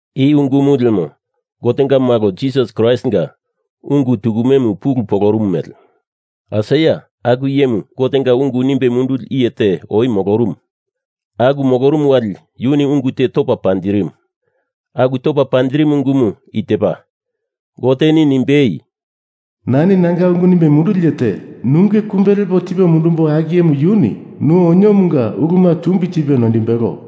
I ungumu lemo, Gotenga malo Jisas Kraistinga ungu tukumemu pulu polorumu mele. Aisaia aku iyemu Gotenga ungu nimbe munduli iye te oi molorumu. Aku molorumu wali yuni ungu te topa panjirimu. Aku topa panjirimu ungumu i tepa, Goteni nimbei, “Nani nanga ungu nimbe munduli iye te nunge kumbe lepo tipo mundumbo aku iyemu yuni nu oniomunga uluma tumbi tipe noindimbelo.”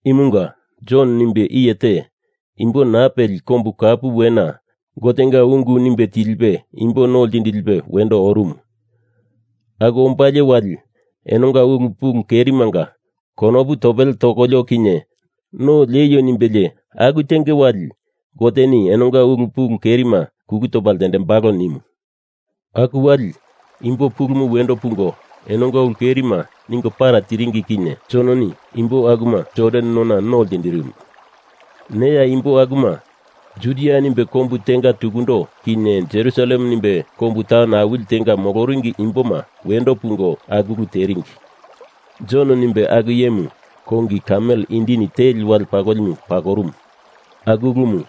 Imunga Jon nimbe iye te imbo naa peli kombu kapu wena Gotenga ungu nimbe tilipe imbo no ltindilipe wendo orumu. Aku ombalie wali, enonga ulu pulu kerimanga konopu topele tokolio kinye no lieio nimbelie aku tenge wali, Goteni enonga ulu pulu kerima kulu topa ltendembalo nimu. Aku wali, imbo pulumu wendo pungo enonga ulu kerima ningo para tiringi kinye Jononi imbo akuma Jordan nona no ltindirimu. Neya aku imboma Judia nimbe kombu tenga tukundo kinye Jerusalem nimbe kombu taun awili tenga moloringi imboma wendo pungo aku ulu teringi. Jon nimbe aku iyemu kongi kamel indini teli wale pakolimu pakorumu aku ulumu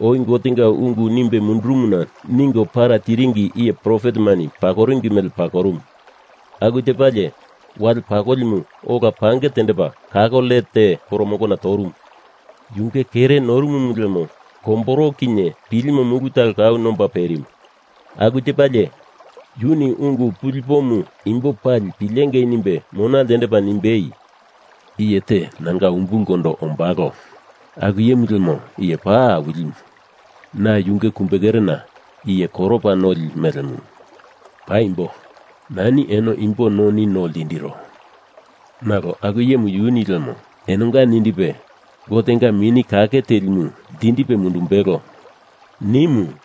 oi Gotenga ungu nimbe mundurumuna ningo para tiringi iye profetemani pakoringi mele pakorumu. Aku tepalie, wale pakolimu ola pange tendepa kako let te poromongona torumu. Yunge kere norumumu lemo komboro kinye pilimo mulu talo kau nomba perimu. Aku tepalie yuni ungu pulipomu imbo pali pilengei nimbe mona ltendepa nimbei, “Iye te nanga umbulkondo ombalo. Aku iyemu lemo iye paa awilimu. Na yunge kumbekerena iye koropa noli melemu. Paimbo, nani eno imbo noni no ltindiro, nalo aku iyemu yuni lemo enonga nindipe Gotenga Mini Kake Telimu ltindipe mundumbelo,” nimu.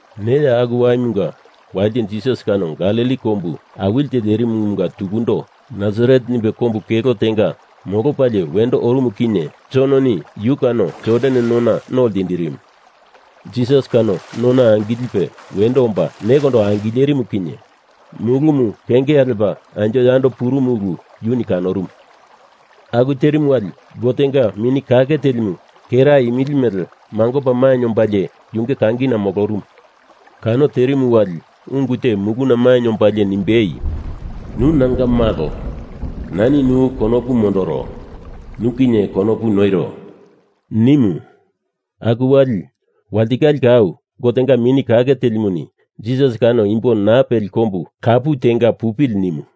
Neya aku waimunga walite Jisas kano Galili kombu awilite lerimumunga tukundo Nasaret nimbe kombu kelo tenga molopalie wendo orumu kinye Jononi yu kano Jordan nona no ltindirimu. Jisas kano nona angilipe wendo omba nekondo angilerimu kinye mulumu kengea lepa anjo yando purumuna ulu yuni kanorumu. Aku terimu wali Gotenga Mini Kake Telimu kera imili mele mangopa mainye ombalie yunge kangina molorumu. Kano terimu wali ungu te muluna mainye ombalie nimbei, “Nu nanga malo. Nani nu konopu mondoro. Nu kinye konopu noiro,” nimu. Aku wali, walitikale kau Gotenga Mini Kake Telimuni Jisas kano imbo naa peli kombu kapu tenga pupili nimu.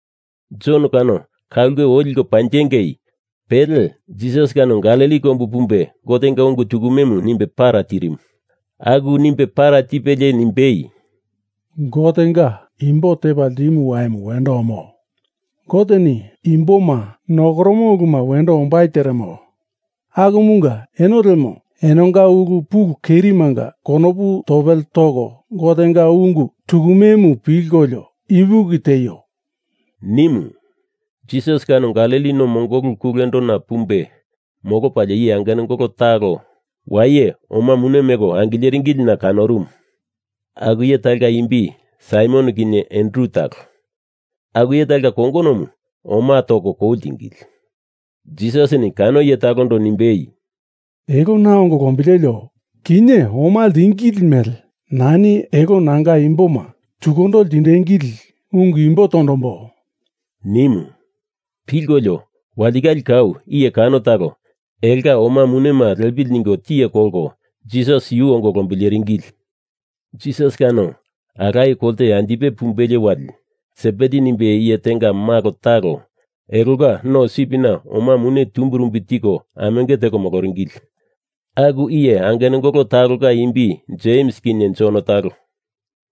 Jon kano ka ulke oi liko panjinge, pele Jisas kano Galili kombu pumbe Gotenga ungu tukumemu nimbe para tirimu. Aku nimbe para tipelie nimbei, “Gotenga imbo tepa ltimo waimu wendo omo. Goteni imboma nokoromo uluma wendo ombai teremo. Akumunga eno lemo enonga ulu pulu kerimanga konopu topele toko Gotenga ungu tukumemu pilkolio ipuki tieio,” nimu. Jisas kano Galili no mongolu kulendona pumbe molopa iye angenungolo talo waye oma mune meko angileringilina kanorumu. Aku iye talonga imbi Saimon kinye Andru talo. Aku iye talonga kongonomu oma toko kou ltingili. Jisasini kano iye talondo nimbei, “Elo na ongo lombilelio. Kinye oma ltingili mele nani elo nanga imboma tukundo ltindengili ungu imbo tondombo,” nimu. Pilkolio, walitikale kau iye kano talo elonga oma munema lepili ningo tiye kolkolo Jisas yu ongo lombileringili. Jisas kano alaye kolte anjipe pumbelie wali, Sebedi nimbe iye tenga malo talo elonga no sipina oma munema tumbirumbi tiko amenge teko moloringili. Aku iye angenungolo talonga imbi Jems kinye Jon talo.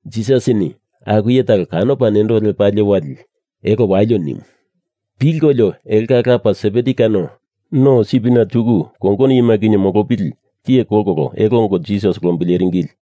Jisasini aku iye talo kanopa nendo lepalie wali, elo walio nimu. Pilkolio, elonga lapa Sebedi kano no sipina tuku kongono iyema kinye molopili tiye kolkolo elo ongo Jisas lombileringili.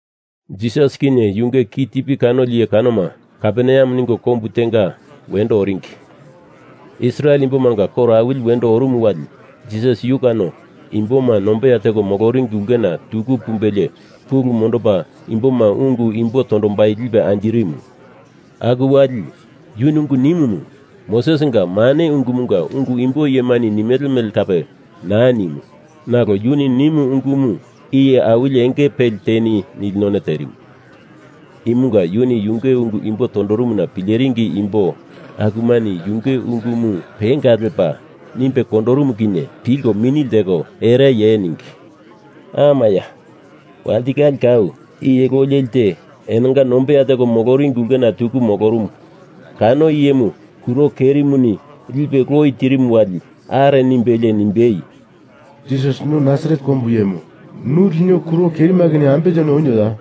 Jisas kinye yunge kitipi kanoli iye kanoma Kaperneam ningo kombu tenga wendo oringi. Israel imbomanga koro awili wendo orumu wali Jisas yu kano imboma nombeya teko moloringi ulkena tuku pumbelie pulu mondopa imboma ungu imbo tondombai lipe anjirimu. Aku wali yuni ungu nimumu Mosesinga mane ungumunga ungu imbo iyemani nimele mele kape naa nimu nalo yuni nimu ungumu iye awili enge peli teni nili none terimu. Imunga yunge ungu imbo tondorumuna pileringi imbo akumani yunge ungumu penga lepa nimbe kondorumu kinye pilkolio mini lteko ereye ningi. Amaya, walitikale kau iye loi leli te enonga nombeya teko moloringiulkena tuku molorumumu kano iyemu kuro kerimuni lipe loi tirimu wali are nimbelie nimbei, “Jisas nu Nasaret kombu iyemu, nu lino kuro kerima kinye ambe teni onioya?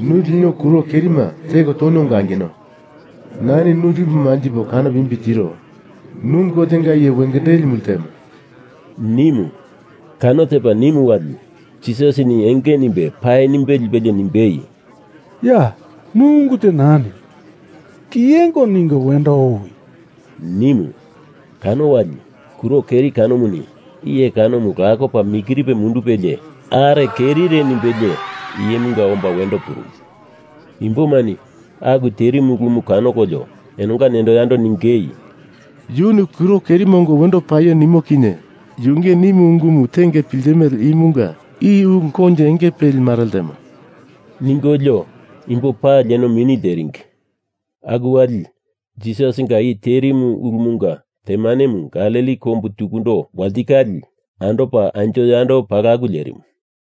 Nu lino kuro kerima teko toni ongo angino. Nani nu lipo manjipo kanopo imbi tiro. Nu Gotenga iye wengendelimu ltemo,” nimu. Kano tepa nimu wali Jisasini enge nimbe paa nimbe lipelie nimbei, “Ya! Nu ungu te naa niwi! Kiyengo ningo wendo owi,” nimu. Kano wali kuro keri kanomuni iye kanomu lakopa mikiripe mundupelie are kerire nimbelie iyemunga omba wendo purumu. Imbomani aku terimu ulumu kanokolio enonga nendo yando ningei, “Yuni kuro kerima ongo wendo paio nimo kinye yunge nimu ungumu tenge piltimele imunga i ulu koinjo enge peli mare ltemo,” ningolio imbo pali eno mini lteringi. Aku wali, Jisasinga i terimu ulumunga temanemu Galili kombu tukundo walitikale andopa anjo yando palaku lerimu.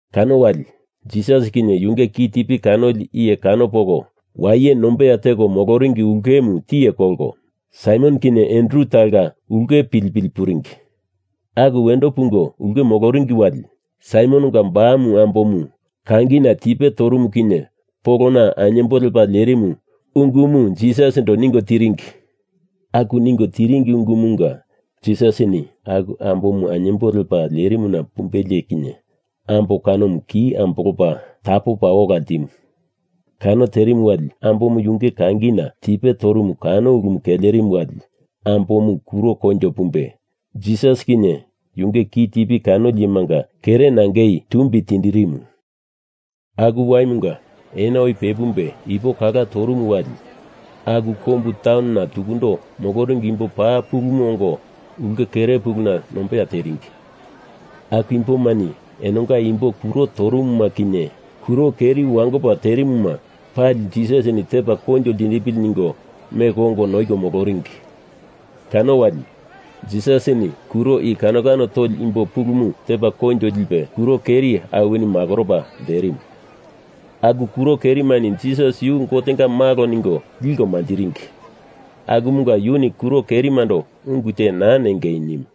Kano wali Jisas kinye yunge kitipi kanoli iye kano poko waye nombeya teko moloringi ulkemu tiye kolko Saimon kinye Andru talonga ulke pilipili puringi. Aku wendo pungo ulke moloringi wali, Saimononga bamu ambomu kangina tipe torumu kinye polona ainyembo lepa lerimu ungumu Jisasindo ningo tiringi. Aku ningo tiringi ungumunga Jisasini aku ambomu ainyembo lepa lerimuna pumbelie kinye ambo kanomu ki ambolopa tapopa ola ltimu. Kano terimu wali ambomu yunge kangina tipe torumu kano ulumu kelerimu wali ambomu kuro koinjo pumbe Jisas kinye yunge kitipi kanoli iyemanga kere nangei tumbi tindirimu. Aku waimunga ena oi pepumbe ipo kala torumu wali aku kombu taunona tukundo moloringi imbo pa pulumu ongo ulke kere puluna nombeya teringi. Aku imbomani enonga imbo kuro torumuma kinye kuro keri wangopa terimuma pali Jisasini tepa koinjo ltindipili ningo meko ongo noiko moloringi. Kano wali, Jisasini kuro i kano kano toli imbo pulumu tepa koinjo lipe kuro keri awini makoropa lterimu. Aku kuro kerimani Jisas yu Gotenga malo ningo liko manjiringi akumunga yuni kuro kerimando ungu te naa nengei nimu.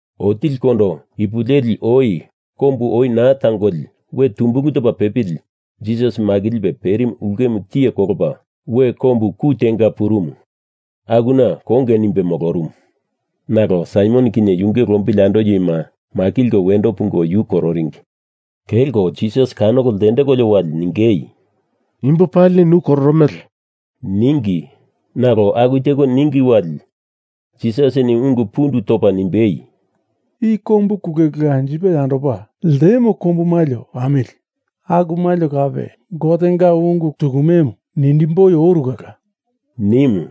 Otilikondo ipu leli oi kombu oi naa tangoli we tumbulu topa pepili Jisas makilipe perimu ulkemu tiye kolopa we kombu ku tenga purumu. Akuna konge nimbe molorumu. Nalo Saimon kinye yunge lombili andoli iyema makilko wendo pungo yu kororingi. Kelko Jisas kanoko ltendekolio wali ningei, “Imbo palini nu kororomele,” ningi. Nalo aku teko ningi wali Jisasini ungu pundu topa nimbei, “I kombu kulekule anjipe yandopa ltemo kombu malio pamili. Aku malio kape na Gotenga ungu tukumemu nindimboi oru kala,” nimu.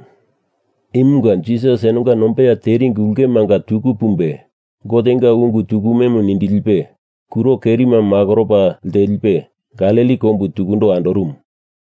Imunga Jisas enonga nombeya teringi ulkemanga tuku pumbe Gotenga ungu tukumemu nindilipe kuro kerima makoropa ltelipe Galili kombu tukundo andorumu.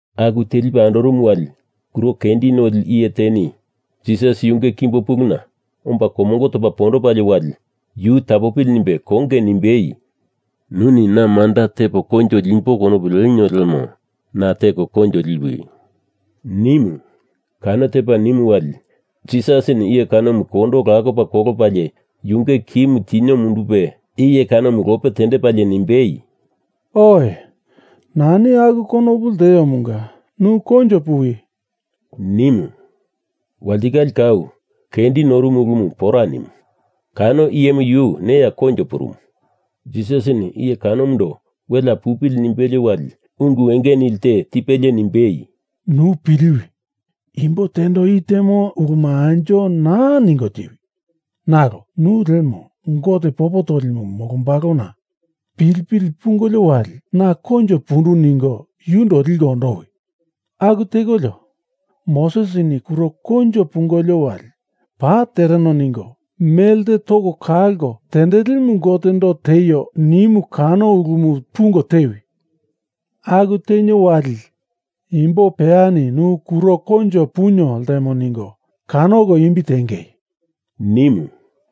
Aku telipe andorumu wali kuro kendi noli iye teni Jisas yunge kimbo puluna omba komongo topa pondopalie wali yu tapopili nimbe konge nimbei, “Nuni na manda tepo koinjo limbo konopu lenio lemo na teko koinjo liwi,” nimu. Kano tepa nimu wali Jisasini iye kanomu kondo lakopa kolopalie yunge kimu tinio mundupe iye kanomu lope tendepalie nimbei, “Oe, nani aku konopu lteomunga nu koinjo puwi,” nimu. Walitikale kau kendi norumu ulumu pora nimu. Kano iyemu yu neya koinjo purumu. Jisasini iye kanomundo welea pupili nimbelie wali ungu enge nili te tipelie nimbei, “Nu piliwi. Imbo tendo i temo ulumu anjo naa ningo tiwi. Nalo nu lemo Gote popo tondolimu molombalona pilipili pungolio wali na koinjo pundu ningo yundo liko ondowi. Aku tekolio Mosesini kuro koinjo pungolio wali paa tereno ningo melte toko kalko tendelimu Gotendo tieio nimu kano ulumu pungo tewi. Aku tenio wali imbo peyani nu kuro koinjo punio ltemo ningo kanoko imbi tiengei,” nimu.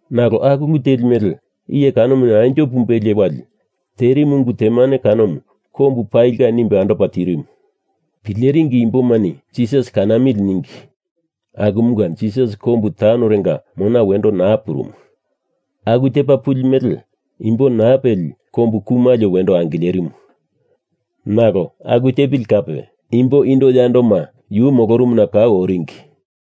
Nalo aku ulu teli mele iye kanomu anjo pumbelie wali terimu ungu temane kanomu kombu palinga nimbe andopa tirimu. Pileringi imbomani Jisasi kanamili ningi akumunga Jisas kombu taunorenga mona wendo naa purumu. Aku tepa puli mele imbo naa peli kombu ku malio wendo angilerimu. Nalo aku tepili kape imbo indo yandoma yu molorumuna kau oringi.